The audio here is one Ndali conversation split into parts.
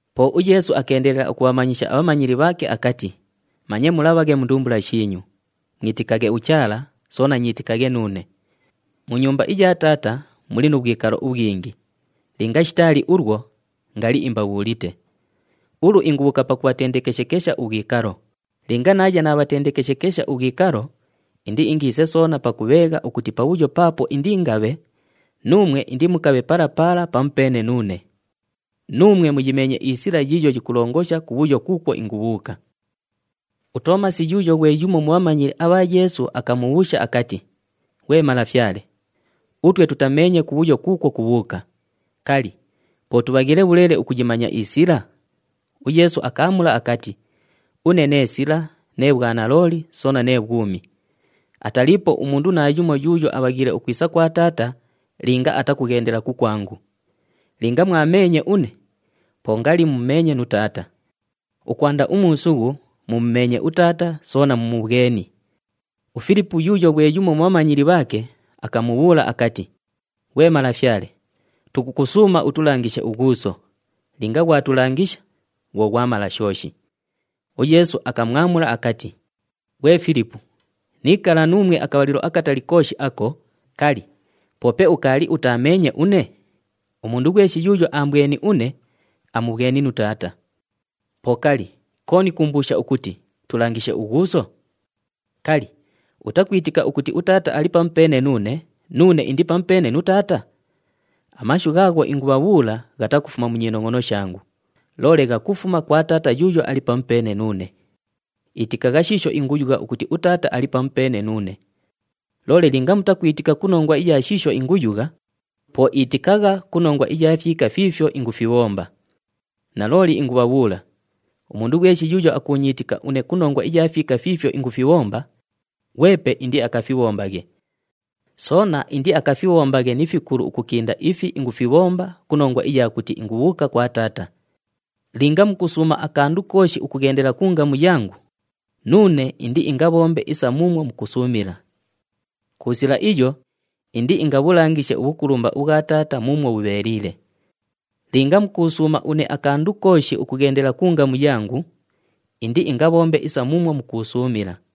Po uYeesu akeendelela ukubhamanyisha abhamanyili bhaake akati, “Manye mulabhaghe mu ndumbula shiinyu. Mwitikaghe uChaala, soona nyiitikaghe nuune. Mu nyumba iya Taata muli nu bhwikalo ubhwingi. Linga shitaali ulwo, ngali imbabhuulite. Ulu ingubhuuka pakubhatendekeshekesha ubhwikalo. Linga naaya naabhatendekeshekesha ubhwikalo, indiingiise soona pakubheegha ukuti pabhuyo paapo indiingabhe, nuumwe indimukabhe pala pala pamupeene nuune. Nuumwe muyimeenye isila yiiyo yikulongosha kubhuyo kuukwo ingubhuuka.” UToomasi yuuyo ghwe yumo mu bhamanyili abha Yeesu akamubhuusha akati, “Ghwe Malafyale, utwe tutameenye kubhuyo kuukwo kubhuuka. Kali, po tubhaghiile bhuleele ukuyimanya isila?” UYeesu akaamula akati, “Une nee sila, nee bhwanalooli soona nee bhwumi. Ataliipo umundu naayumo yuuyo abhaghiile ukwisa kwa Taata linga atakughendela kukwangu. Linga mwameenye une, po ngali mumumeenye nu Taata. Ukwanda umuusughu, mumumeenye uTaata soona mumubhweni.” UFilipu yuuyo ghwe yumo mu bhamanyili bhaake, akamubhuula akati, “Ghwe Malafyale, tukukusuuma utulangishe uGhuuso. Linga ghwatulangisha, bhwo ghwamala shooshi.” UYeesu akamwamula akati, “Ghwe Filipu, niikala nuumwe akabhalilo akatali kooshi ako, kali, poope ukaali utaameenye une? Umundu ghweshi yuuyo aambweni une, amubhweni nu Taata. Po kali, kooni kuumbuusha ukuti, ‘Tulangishe uGhuuso’? Kali, utakwitika ukuti uTaata ali pamupeene nuune, nuune indi pamupeene nu Taata? Amashu ghaagho ingubhabhuula ghatakufuma mu nyinongʼono shangu, loole ghakufuma kwa Taata yuuyo ali pamupeene nuune. Itikagha shiisho inguyugha ukuti uTaata ali pamupeene nuune. Loole linga mutakwitika ku nongwa iya shiisho inguyugha, po itikagha ku nongwa iya fyika fiifyo ingufibhomba. Nalooli ingubhabhuula, umundu ghweshi yuuyo akuunyiitika une ku nongwa iya fyika fiifyo ingufibhomba, ghwepe indiakafibhombaghe. Soona indiakafibhombaghe ni fikulu ukukinda ifi ingufibhomba ku nongwa iya kuti ingubhuuka kwa Taata. Linga mukusuuma akandu kooshi ukughendela ku ngamu yangu, nuune indiingabhombe isa muumwo mukusuumila. Ku sila iyo, indiingabhulangishe ubhukulumba ubhwa Taata muumwo bhubheeliile. Linga mukuusuuma une akandu kooshi ukughendela ku ngamu yangu, indiingabhombe isa muumwo mukuusuumila.”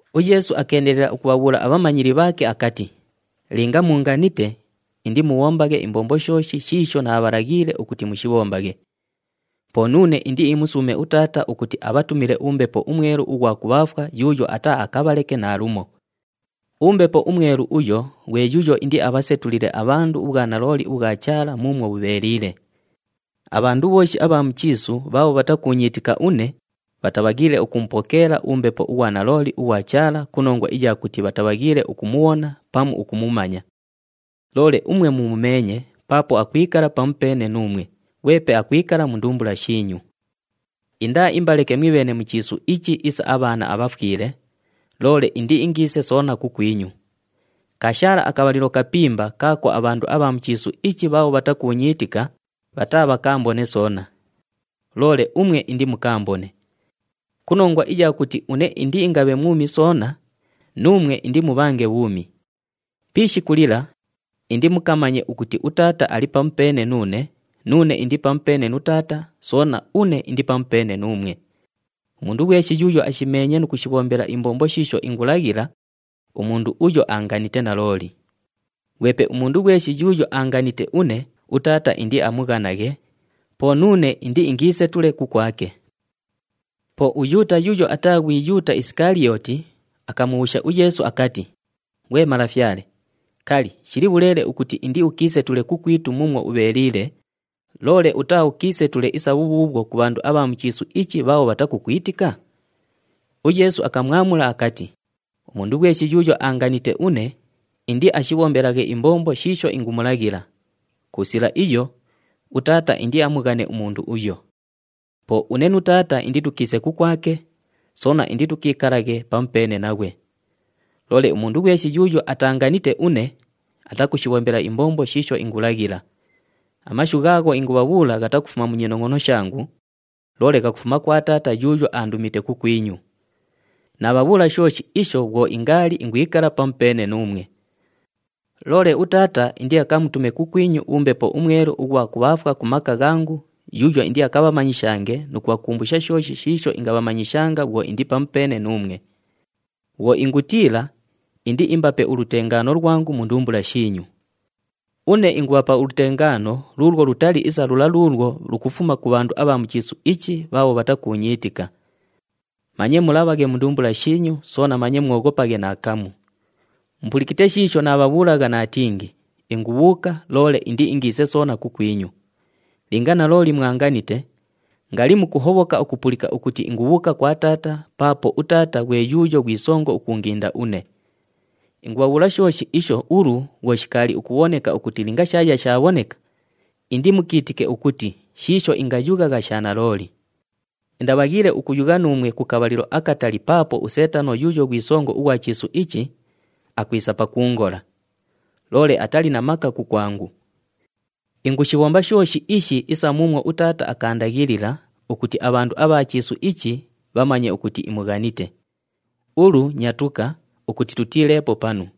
UYeesu akeendelela ukubhabhuula abhamanyili bhaake akati, “Linga muunganite, indimubhombaghe imbombo shooshi shiisho naabhalaghiile ukuti mushibhombaghe. Po nuune indiimusuume uTaata ukuti abhatumile uMbepo uMwelu ughwa kubhaafwa yuuyo ataaakabhaleke naalumo. UMbepo uMwelu uyo ghwe yuuyo indiabhasetulile abhandu ubhwanalooli ubhwa Chaala muumwo bhubheeliile. Abhandu bhooshi abha mu chiisu bhaabho bhatakuunyiitika une, bhatabhaghiile ukumupokeela uMbepo ughwa nalooli ughwa Chaala ku nongwa iya kuti bhatabhaghiile ukumubhona pamu ukumumanya. Loole umwe mumumeenye paapo akwikala pamupeene nuumwe ghwepe akwikala mu ndumbula shiinyu. Indaaimbaleke mwibheene mu chiisu ichi isa abhaana abhafwile, loole indiingiise soona kukwinyu. Kaashaala akabhalilo kapimba kaako abhandu abha mu chiisu ichi bhaabho bhatakuunyiitika, bhataabhakaambone soona. Loole umwe indimukaambone. Ku nongwa iya kuti une indiingabhe mwumi soona, nuumwe indimubhange bhuumi. Pi ishiku lila, indimukamanye ukuti uTaata ali pamupeene nuune, nuune indi pamupeene nu Taata, soona une indi pamupeene nuumwe. Umundu ghweshi yuuyo ashimeenye nu kushibhombela imbombo shiisho ingulaghila, umundu uyo aanganite nalooli. Ghwepe umundu ghweshi yuuyo aanganite une, uTaata indiamughanaghe, po nuune indiingiisetule kukwake.” Po uYuuta yuuyo ataa ghwi Yuuta Isikaliyooti, akamubhuusha uYeesu akati, “Ghwe Malafyale, kali, shili bhuleele ukuti indiukiisetule kukwitu muumwo ubheeliile, loole utaaukiisetule isa bhubhuubhwo ku bhandu abha mu chiisu ichi bhaabho bhatakukwitika?” UYeesu akamwamula akati, “Umundu ghweshi yuuyo aanganite une, indiashibhombelaghe imbombo shiisho ingumulaghila. Ku sila iyo, uTaata indiamughane umundu uyo. Po une nu Taata inditukiise kukwake, soona inditukiikalaghe pamupeene naghwe. Loole umundu ghweshi yuuyo ataanganite une, atakushibhombela imbombo shiisho ingulaghila. Amashu ghaagho ingubhabhuula ghatakufuma mu nyinongʼono shangu, loole ghakufuma kwa Taata yuuyo aandumite kukwinyu. Naabhabhuula shooshi isho bhwo ingaali ingwikala pamupeene nuumwe. Loole uTaata indiakamutume kukwinyu uMbepo uMwelu ughwa kubhaafwa ku maka ghangu yuuyo indiakabhamanyishange nu kubhakumbusha shooshi shiisho ingabhamanyishanga bhwo indi pamupeene nuumwe. Bhwo ingutiila, indiimbape ulutengaano lwangu mu ndumbula shiinyu. Une ingubhapa ulutengaano luulwo lutali isa lula luulwo lukufuma ku bhandu abha mu chiisu ichi bhaabho bhatakuunyiitika. Manye mulabhaghe mu ndumbula shiinyu soona manye mwoghopaghe naakamu. Mupulikite shiisho naabhabhuulagha naatingi, ‘Ingubhuuka, loole indiingiise soona kukwinyu.’ Linga nalooli mwanganite, ngali mukuhobhoka ukupulika ukuti ingubhuuka kwa Taata paapo uTaata ghwe yuuyo ghwi songo ukuunginda une. Ingubhabhuula shooshi isho ulu bhwo shikaali ukubhoneka ukuti linga shaaya shaabhoneka, indimukiitike ukuti shiisho ingayughagha sha nalooli. Indabhaghiile ukuyugha nuumwe ku kabhalilo akatali paapo uSeetano yuuyo ghwi songo ughwa chiisu ichi, akwisa pakuungola. Loole atali na maka kukwangu. Ingushibhomba shooshi ishi isa muumwo uTaata akaandaghilila ukuti abhandu abha chiisu ichi bhamanye ukuti imughanite. Ulu, nyatuka ukuti tutiileepo panu.”